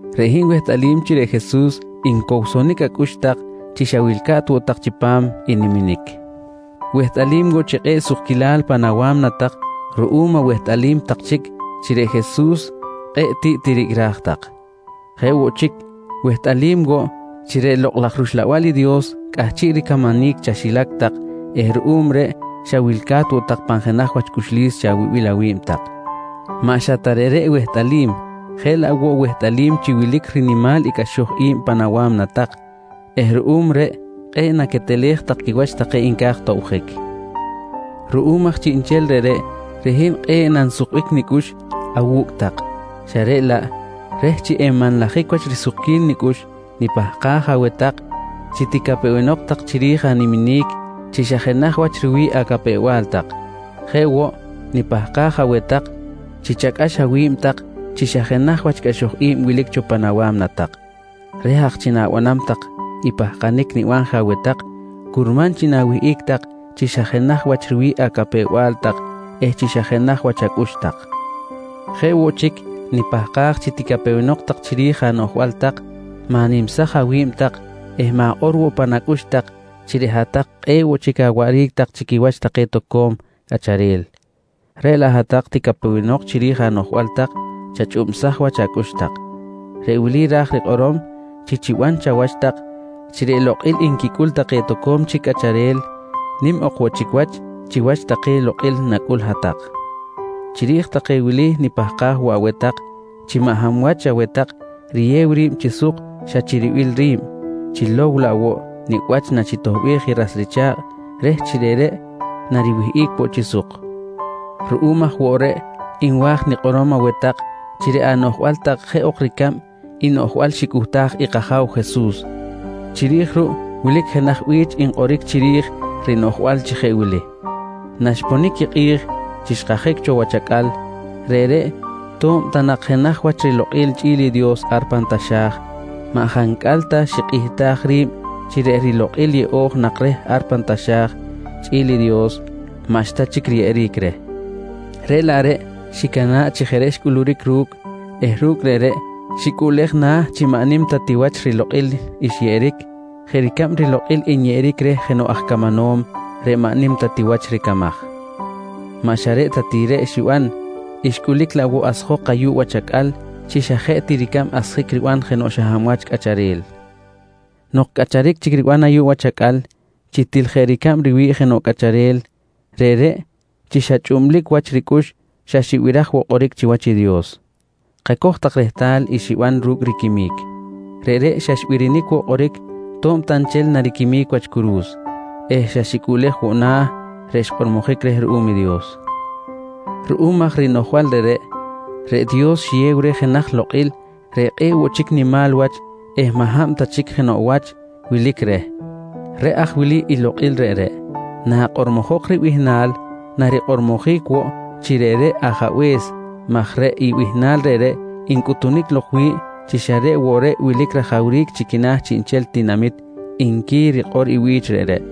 Reꞌ hin wehtꞌalim chi reꞌ Jesus ncowsonic acꞌux tak chi xa wilca̱t woꞌ tak chipam i niminic. Wehtꞌalim woꞌ chi kꞌe̱ꞌ sukquilal pan awa̱mna tak ruꞌum awehtꞌalim tak chic chi reꞌ Jesus kꞌe̱ꞌ tiꞌ tiricꞌraj tak. Jeꞌ woꞌ chic, wehtꞌalim woꞌ chi reꞌ Lokꞌ laj rUxlabal i Dios cꞌahchiꞌ ricamanic chaxilac tak eh ruꞌum reꞌ xa wilca̱t woꞌ tak pan jenaj wach cꞌuxlis chawibil awi̱b tak. Maꞌ xa ta reꞌreꞌ wehtꞌalim jeꞌ laꞌ woꞌ wehtꞌalim chi wilic rinimal i cꞌaxoj i̱b pan awa̱mna tak eh ruꞌum reꞌ kꞌe̱ꞌ naquetelej tak quiwach take nca̱j tobjic. Ruꞌum aj chiꞌnchel reꞌreꞌ, reꞌ hin kꞌe̱ꞌ nansukbic nicꞌux awu̱cꞌ tak, xa reꞌ laꞌ reh chi enmanlajic wach risukquil nicꞌux nipahkaj aweh tak chi ticapewenok tak chiri̱j animinic chi xa jenaj wach riwi̱ꞌ acapew-bal tak. Jeꞌ woꞌ, nipahkaj aweh tak chi chacꞌax awi̱b tak chi xa jenaj cꞌaxoj i̱b wilic cho pan awa̱mna tak. Reh aj chi na̱banam tak i pahkanic niban je aweh tak curman chi na̱wihꞌic tak chi xa jenaj wach riwi̱ꞌ acapew-bal tak eh chi xa jenaj wach acꞌux tak. Jeꞌ woꞌ chic nipahkaj chi naticapewenok tak chiri̱j anoꞌjbal tak, ma̱nimsaj awi̱b tak eh ma̱kꞌor woꞌ pan acꞌux tak chi reꞌ hat-tak kꞌe̱ꞌ woꞌ chic awaꞌric tak chi quiwach take toco̱m cꞌacharel. Reꞌ laꞌ hat-tak naticapewenok chiri̱j anoꞌjbal tak, chachꞌubsaj wach acꞌux tak. Reꞌ wili ra̱j rikꞌorom chi chiban chawach tak chi reꞌ lokꞌil nquicꞌul take toco̱m chic cꞌacharel nim ok woꞌ chic wach chiwach take lokꞌil nacꞌul i hat-tak. Chiri̱j take wili nipahkaj woꞌ aweh tak chi maꞌ hab wach aweh tak riyew ri̱b chi suk xa chi ribil ri̱b, chilow laꞌ woꞌ nicꞌ wach nachitoꞌbej i ras richa̱kꞌ reh chi reꞌreꞌ nariwihꞌic woꞌ chi suk. Ruꞌum aj woꞌ reꞌ nwa̱j nikꞌorom aweh tak chi reꞌ anoꞌjbal tak jeꞌ ok ricab i noꞌjbal xicꞌuhtaj i kAja̱w Jesus, chiri̱j ruꞌ wilic jenaj bi̱ch nkꞌoric chiri̱j rinoꞌjbal chi jeꞌ wili: “Naxponic i kꞌi̱j chi xkajic cho wach acꞌal, reꞌreꞌ to̱b ta nak jenaj wach rilokꞌil chꞌi̱l Dios ar pan taxa̱j, maꞌ jancꞌal ta xikꞌihtaj ri̱b chi reꞌ rilokꞌil yeꞌo̱j nak reh ar pan taxa̱j chꞌi̱l i Dios, maꞌxta chic riyeꞌeric reh. Reꞌ laꞌ reꞌ xicana̱ꞌ chi jeꞌ reꞌ xcꞌuluric ru̱cꞌ eh ru̱cꞌ reꞌreꞌ xicꞌuꞌlej na̱ chi maꞌ nim ta ti wach i rilokꞌil xyeꞌeric jeꞌ ricab rilokꞌil nyeꞌeric reh jenoꞌ aj camanom reꞌ maꞌ nim ta ti wach ricamaj. Maꞌ xa reꞌ ta ti reꞌ xiban, xcꞌulic laꞌ woꞌ asjok ayuꞌ wach acꞌal chi xa jeꞌ ti ricab asjic riban jenoꞌ xa hab wach cꞌacharel. Nok cꞌacharic chic riban ayuꞌ wach acꞌal chi til jeꞌ ricab riwi̱ꞌ jenoꞌ cꞌacharel, reꞌreꞌ chi xa chꞌublic wach ricꞌux xa xibiraj woꞌ kꞌoric chiwach i Dios. Kacoj rehtal i xiban ru̱cꞌ riquimic. Reꞌreꞌ xa xbirinic woꞌ kꞌoric to̱b ta nchel nariquimic wach curu̱s eh xa xicꞌuꞌlej woꞌ na̱ reꞌ xkꞌormojic reh ruꞌum i Dios. Ruꞌum aj rinoꞌjbal reꞌreꞌ, reꞌ Dios xiyew reh jenaj lokꞌil reꞌ kꞌe̱ꞌ woꞌ chic nimal wach eh maꞌ hab ta chic jenoꞌ wach wilic reh. Reꞌ aj wili i lokꞌil reꞌreꞌ: Nakꞌormojok ribihnal, narikꞌormojic woꞌ chi reꞌreꞌ Ajabe̱s maj reꞌ i bihnal reꞌreꞌ ncꞌuhtunic lok wi̱ꞌ chi xa reꞌ woꞌ reꞌ wilic rajawric chi quina̱ chiꞌnchel tinamit, nqui rikꞌor i bi̱ch reꞌreꞌ.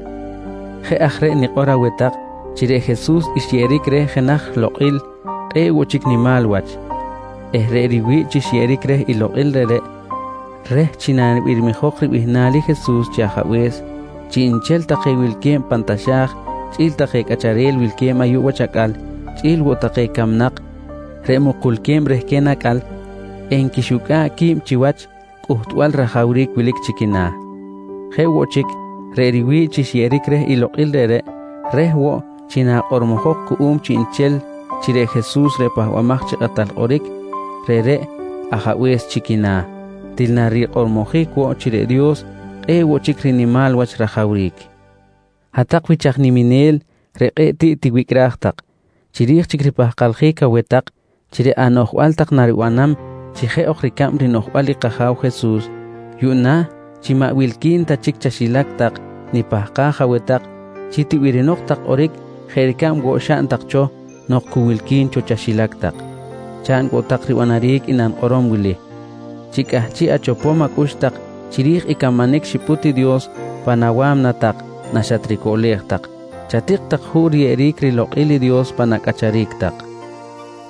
Jeꞌ aj reꞌ nikꞌor aweh tak chi reꞌ Jesus xyeꞌeric reh jenaj lokꞌil kꞌe̱ꞌ woꞌ nimal wach eh reꞌ riwi̱ꞌ chi xyeꞌeric reh i lokꞌil reꞌreꞌ, reh chi nabirmijok ribihnal i Jesus chi Ajabe̱s, chiꞌnchel take wilque̱b pan taxa̱j chꞌi̱l take cꞌacharel wilque̱b ayuꞌ wach acꞌal, chꞌi̱l woꞌ take camnak reꞌ mukulque̱b rehquen acꞌal, enquixucꞌa̱ꞌ qui̱b chiwach cꞌuhtbal rajawric wilic chi quina̱. Jeꞌ woꞌ chic, reꞌ riwi̱ꞌ chi xyeꞌeric reh i lokꞌil reꞌreꞌ reh woꞌ chi nakꞌormojok cuꞌum chiꞌnchel chi reꞌ Jesus reꞌ Pahbamaj chi Kꞌatal Kꞌoric, reꞌreꞌ Ajabe̱s chi quina̱, til narikꞌormojic woꞌ chi reꞌ Dios kꞌe̱ꞌ woꞌ chic rinimal wach rajawric. Hat-tak wich aj niminel reꞌ kꞌe̱ꞌ tiꞌ tiwicꞌraj tak, chiri̱j chic ripahkaljic aweh tak chi reꞌ anoꞌjbal tak naribanam chi jeꞌ ok ricab rinoꞌjbal i kAja̱w Jesus, yuꞌna chi maꞌ wilqui̱n ta chic chaxilac tak nipahkaj aweh tak chi tibirinok tak kꞌoric jeꞌ ricab woꞌ xaꞌn tak cho nok cu wilqui̱n cho chaxilac tak. Chaꞌn woꞌ tak ribanaric i nanikꞌorom wili: Chi cꞌahchiꞌ achopom acꞌux tak chiri̱j i camanic xipꞌut i Dios pan awa̱mna tak naxatricoꞌlej tak, chatik tak juꞌ riyeꞌeric rilokꞌil i Dios pan acꞌacharic tak.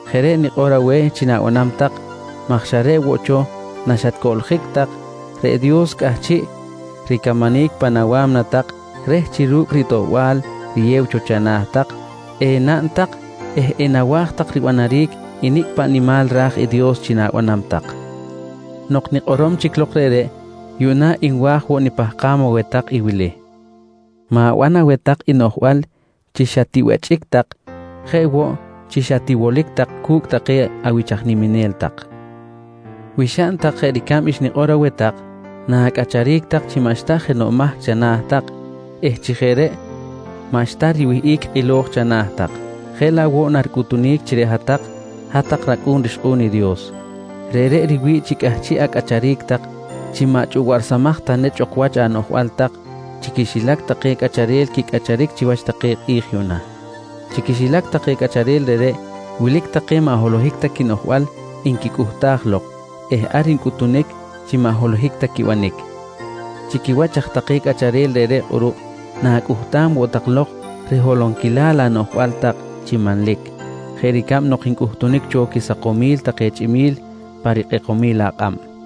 Jeꞌ reꞌ nikꞌor aweh chi na̱banam tak maj xa reꞌ woꞌ cho naxatcoꞌljic tak reꞌ Dios cꞌahchiꞌ ricamanic pan awa̱mna tak reh chi ru̱cꞌ i ritoꞌbal riyew cho chana̱ tak enaꞌn tak eh enawa̱j tak ribanaric i nicꞌ paꞌ nimal ra̱j i Dios chi na̱banam tak. Nok nikꞌorom chic lok reꞌreꞌ, yuꞌna nwa̱j woꞌ nipahkam aweh tak i wili: Ma̱ban aweh tak i noꞌjbal chi xa tibechꞌic tak jeꞌ woꞌ chi xa tiwolic tak cu̱cꞌ take awich aj niminel tak. Wi xaꞌn tak jeꞌ ricab xnikꞌor aweh tak, na̱cꞌacharic tak chi maꞌxta jenoꞌ mahc chana̱ tak eh chi jeꞌ reꞌ maꞌxta riwihꞌic kꞌilo̱j chana̱ tak, jeꞌ laꞌ woꞌ naricꞌuhtunic chi reꞌ hat-tak, hat-tak racꞌu̱n rixkꞌu̱n i Dios. Reꞌreꞌ riwi̱ꞌ chi cꞌahchiꞌ acꞌacharic tak chi maꞌ chꞌuwaꞌrsamaj ta nechꞌ ok wach anoꞌjbal tak chi quixilac take cꞌacharel quicꞌacharic chiwach take kꞌi̱j yuꞌna. Chi quixilac take cꞌacharel reꞌreꞌ, wilic take maꞌ holohic ta quinoꞌjbal nquicꞌuhtaj lok eh ar ncꞌutunic chi maꞌ holohic ta quibanic. Chi quiwach aj take cꞌacharel reꞌreꞌ kꞌuruꞌ na̱cꞌuhtam woꞌ tak lok riholonquilal anoꞌjbal tak chi manlic jeꞌ ricab nok ncꞌuhtunic cho quisakomil take chꞌimi̱l pa rikꞌekomil akꞌab. Yuꞌna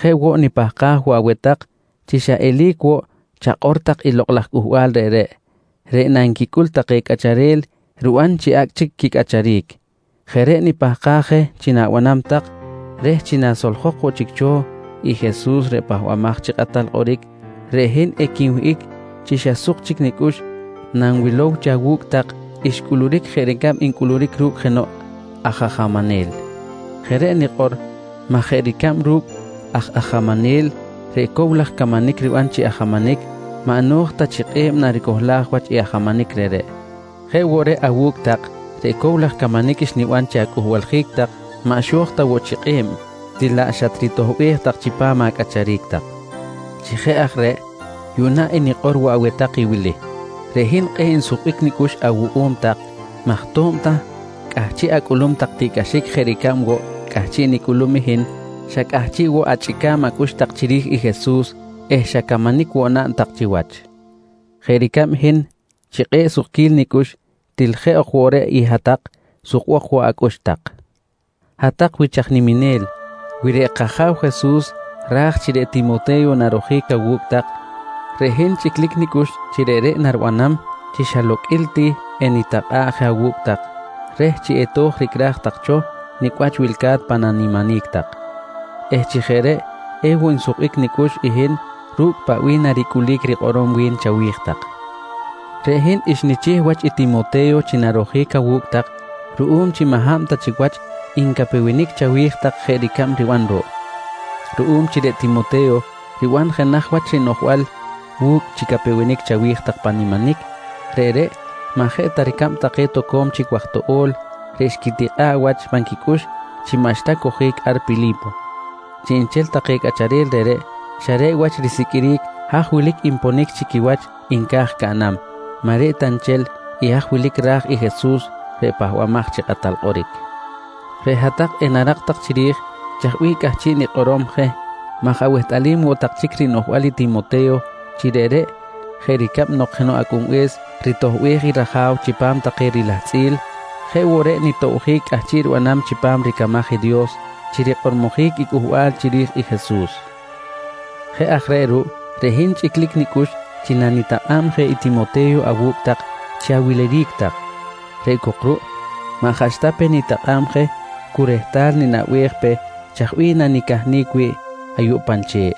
jeꞌ woꞌ nipahkaj woꞌ aweh tak chi xa eli̱c woꞌ chakꞌor tak i lokꞌ laj cꞌuhbal reꞌreꞌ, reꞌ nanquicꞌul take cꞌacharel riban chi acꞌ chic cꞌacharic. Jeꞌ reꞌ nipahkaj je chi na̱banam tak reh chi nasoljok woꞌ chic cho i Jesus reꞌ Pahbamaj chi Kꞌatal Kꞌoric, reꞌ hin equinwihꞌic chi xa suk chic nicꞌux nanwilow chi awu̱cꞌ tak xcꞌuluric jeꞌ ricab ncꞌuluric ru̱cꞌ jenoꞌ aj ajamanel. Jeꞌ reꞌ nikꞌor maj jeꞌ ricab ru̱cꞌ aj ajamanel reꞌ cow laj camanic riban chi ajamanic maꞌ no̱j ta chi kꞌe̱b naricohlaj wach i ajamanic reꞌreꞌ, jeꞌ woꞌ reꞌ awu̱cꞌ tak reꞌ cow laj camanic xniban chi acꞌuhbaljic tak maꞌ xo̱j ta woꞌ chi kꞌe̱b, til xatritoꞌbej laꞌ chipam acꞌacharic tak. Chi jeꞌ aj reꞌ, yuꞌna enikꞌor woꞌ aweh tak i wili: Reꞌ hin kꞌe̱ꞌ nsukbic nicꞌux awuꞌum tak maj to̱b ta cꞌahchiꞌ acꞌulum tak tiꞌcꞌaxic jeꞌ ricab woꞌ cꞌahchiꞌ nicꞌulum i hin, xa cꞌahchiꞌ woꞌ achꞌica̱b acꞌux tak chiri̱j i Jesus eh xa camanic woꞌ naꞌn tak chiwach. Jeꞌ ricab hin chi kꞌe̱ꞌ sukquil nicꞌux til jeꞌ ok woꞌ reꞌ i hat-tak sukbok woꞌ acꞌux tak. Hat-tak wich aj niminel, wi reꞌ kAja̱w Jesus ra̱j chi reꞌ Timote̱yo narojic awu̱cꞌ tak, reꞌ hin chꞌiclic nicꞌux chi reꞌreꞌ naribanam chi xa loqꞌuil ti enitakꞌa̱ꞌ je awu̱cꞌ tak reh chi eto̱j ricꞌraj tak cho nicꞌ wach wilca̱t pan animinic tak eh chi jeꞌ reꞌ ewoꞌ nsukbic nicꞌux i hin ru̱cꞌ paꞌ bih naricꞌulic rikꞌorom wi̱n chawi̱j tak. Reꞌ hin xnichih wach i Timote̱yo chi narojic awu̱cꞌ tak ruꞌum chi maꞌ hab ta chic wach ncapewenic chawi̱j tak jeꞌ ricab riban ruꞌ. Ruꞌum chi reꞌ Timote̱yo riban jenaj wach rinoꞌjbal wu̱cꞌ chi capewenic chawi̱j tak pan animinic, reꞌreꞌ maꞌ jeꞌ ta ricab take toco̱m chic waj toꞌo̱l reꞌ xquitikꞌa̱ꞌ wach pan quicꞌux chi maꞌxta cojic ar Pili̱po. Chiꞌnchel take reꞌreꞌ xa reꞌ wach risiqꞌuiric haj wilic nponic chi quiwach nca̱j caꞌnam, maꞌ reꞌ ta nchel i haj wilic ra̱j i Jesus reꞌ Pahbamaj chi Kꞌatal Kꞌoric. Reꞌ hat-tak enarak tak chiri̱j chaj bih cꞌahchiꞌ nikꞌorom je maj awehtꞌalim woꞌ tak chic rinoꞌjbal i Timote̱yo chi reꞌreꞌ jeꞌ ricab nok jenoꞌ acꞌunbe̱s ritoꞌbej i raja̱w chipam take rilahtzꞌil, jeꞌ woꞌ reꞌ nitobjic cꞌahchiꞌ ribanam chipam ricamaj i Dios chi rikꞌormojic i cꞌuhbal chiri̱j i Jesus. Jeꞌ aj reꞌ ruꞌ reꞌ hin chꞌiclic nicꞌux chi nanitakꞌa̱b je i Timote̱yo awu̱cꞌ tak chi awiliric tak. Reꞌ cok ruꞌ maꞌ jaꞌ xta pe nitakꞌa̱b je cu rehtal ninaꞌbej pe chaj bih nanicahnic wi̱ꞌ ayuꞌ pan che̱ꞌ.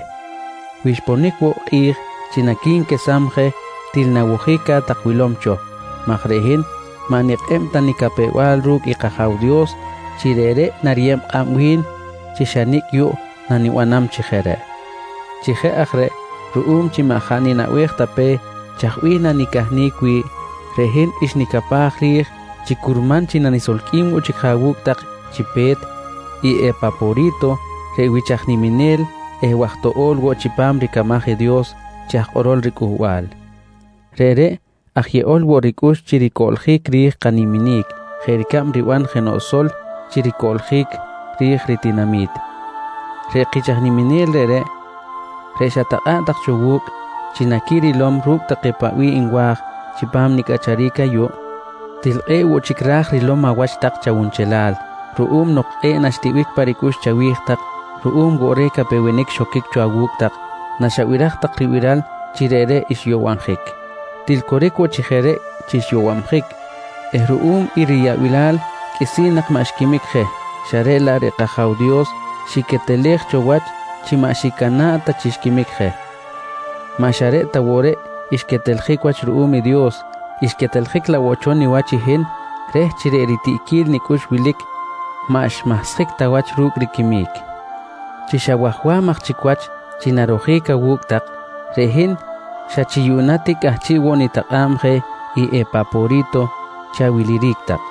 Wi xponic woꞌ kꞌi̱j chi naqui̱nquesam je til nawojic ca̱t tak wilom cho maj reꞌ hin maꞌ nikꞌeb ta nicapew-bal ru̱cꞌ i kAja̱w Dios chi reꞌreꞌ nariyeb kꞌab wi̱n chi xa nicꞌ yuꞌ nanibanam chi jeꞌ reꞌ. Chi jeꞌ aj reꞌ ruꞌum chi maꞌ jaꞌ ninaꞌbej ta pe chaj bih nanicahnic wi̱ꞌ, reꞌ hin xnicapaj ri̱j chi curman chi nanisolqꞌuim woꞌ chic je awu̱cꞌ tak chi pe̱t i Epapori̱to reꞌ wich aj niminel eh waj toꞌo̱l woꞌ chipam ricamaj i Dios chi aj kꞌorol riCꞌuhbal. Reꞌreꞌ aj yeꞌol woꞌ ricꞌux chi ricoꞌljic ri̱j kaniminic jeꞌ ricab riban jenoꞌ sol chi ricoꞌljic ri̱j ritinami̱t. Reꞌ kich aj niminel reꞌreꞌ, reꞌ xatakꞌa̱ꞌ tak cho wu̱cꞌ chi naquirilom ru̱cꞌ take paꞌ bih nwa̱j chipam nicꞌacharic ayuꞌ, til kꞌe̱ꞌ woꞌ chic ra̱j rilom awach tak chawunchelal ruꞌum nok kꞌe̱ꞌ naxtiꞌbic pa ricꞌux chawi̱j tak ruꞌum woꞌ reh capewenic xoquic cho awu̱cꞌ tak naxabiraj tak ribiral chi reꞌreꞌ xyowabjic. Til coric woꞌ chi jeꞌ reꞌ chi xyowabjic eh ruꞌum i riyaꞌbilal qꞌuisi̱n nak maꞌ xquimic je xa reꞌ laꞌ reꞌ kAja̱w Dios xiquetelej cho wach chi maꞌ xicana̱ꞌ ta chi xquimic je. Maꞌ xa reꞌ ta woꞌ reꞌ xqueteljic wach ruꞌum i Dios, xqueteljic laꞌ woꞌ cho niwach i hin reh chi reꞌ ritiꞌquil nicꞌux wilic maꞌ xmahsjic ta wach ru̱cꞌ riquimic. Chi xa wajwam aj chic wach chi narojic awu̱cꞌ tak, reꞌ hin xa chi yuꞌna ti cꞌahchiꞌ woꞌ chic nitakꞌa̱b je i Epapori̱to chi awiliric tak.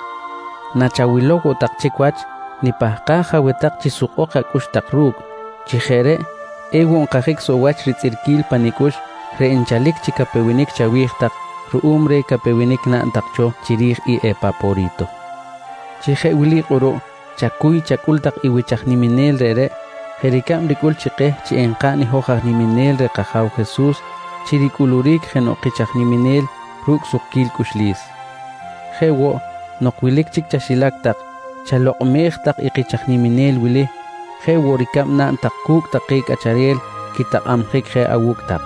Nachawilow woꞌ tak chic wach, nipahkaj aweh tak chi sukbok acꞌux tak ru̱cꞌ, chi jeꞌ reꞌ ewoꞌ nkajic soꞌ wach ritzꞌirquil pa nicꞌux reꞌ nchalic chi capewenic chawi̱j tak ruꞌum reh capewenic naꞌn tak cho chiri̱j i Epapori̱to. Chi jeꞌ wili kꞌuruꞌ chacuy chacꞌul tak i wich aj niminel reꞌreꞌ jeꞌ ricab ricꞌul chi keh chi enkaꞌn i hoj aj niminel reh kAja̱w Jesus chi ricꞌuluric jenoꞌ kich aj niminel ru̱cꞌ sukquil cꞌuxlis. Jeꞌ woꞌ nok wilic chic chaxilac tak chalokꞌmej tak i kich aj niminel wili jeꞌ woꞌ ricab naꞌn tak cu̱cꞌ take cꞌacharel quitakꞌabjic je awu̱cꞌ tak.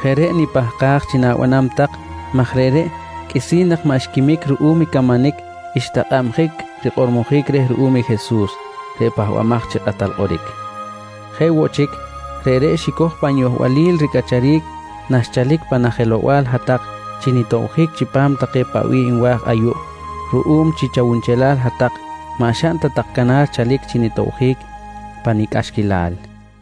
Jeꞌ reꞌ nipahkaj chi na̱banam tak maj reꞌreꞌ qꞌuisi̱n nak maꞌ xquimic ruꞌum i camanic xtakꞌabjic rikꞌormojic reh ruꞌum i Jesus reꞌ Pahbamaj chi Kꞌatal Kꞌoric. Jeꞌ woꞌ chic, reꞌreꞌ xicoj pan yohbalil ricꞌacharic naxchalic pan ajelow-bal hat-tak chi nitobjic chipam take paꞌ bih nwa̱j ayuꞌ ruꞌum chi chawunchelal hat-tak maꞌ xaꞌn ta tak canar chalic chi nitobjic pa nicꞌaxquilal.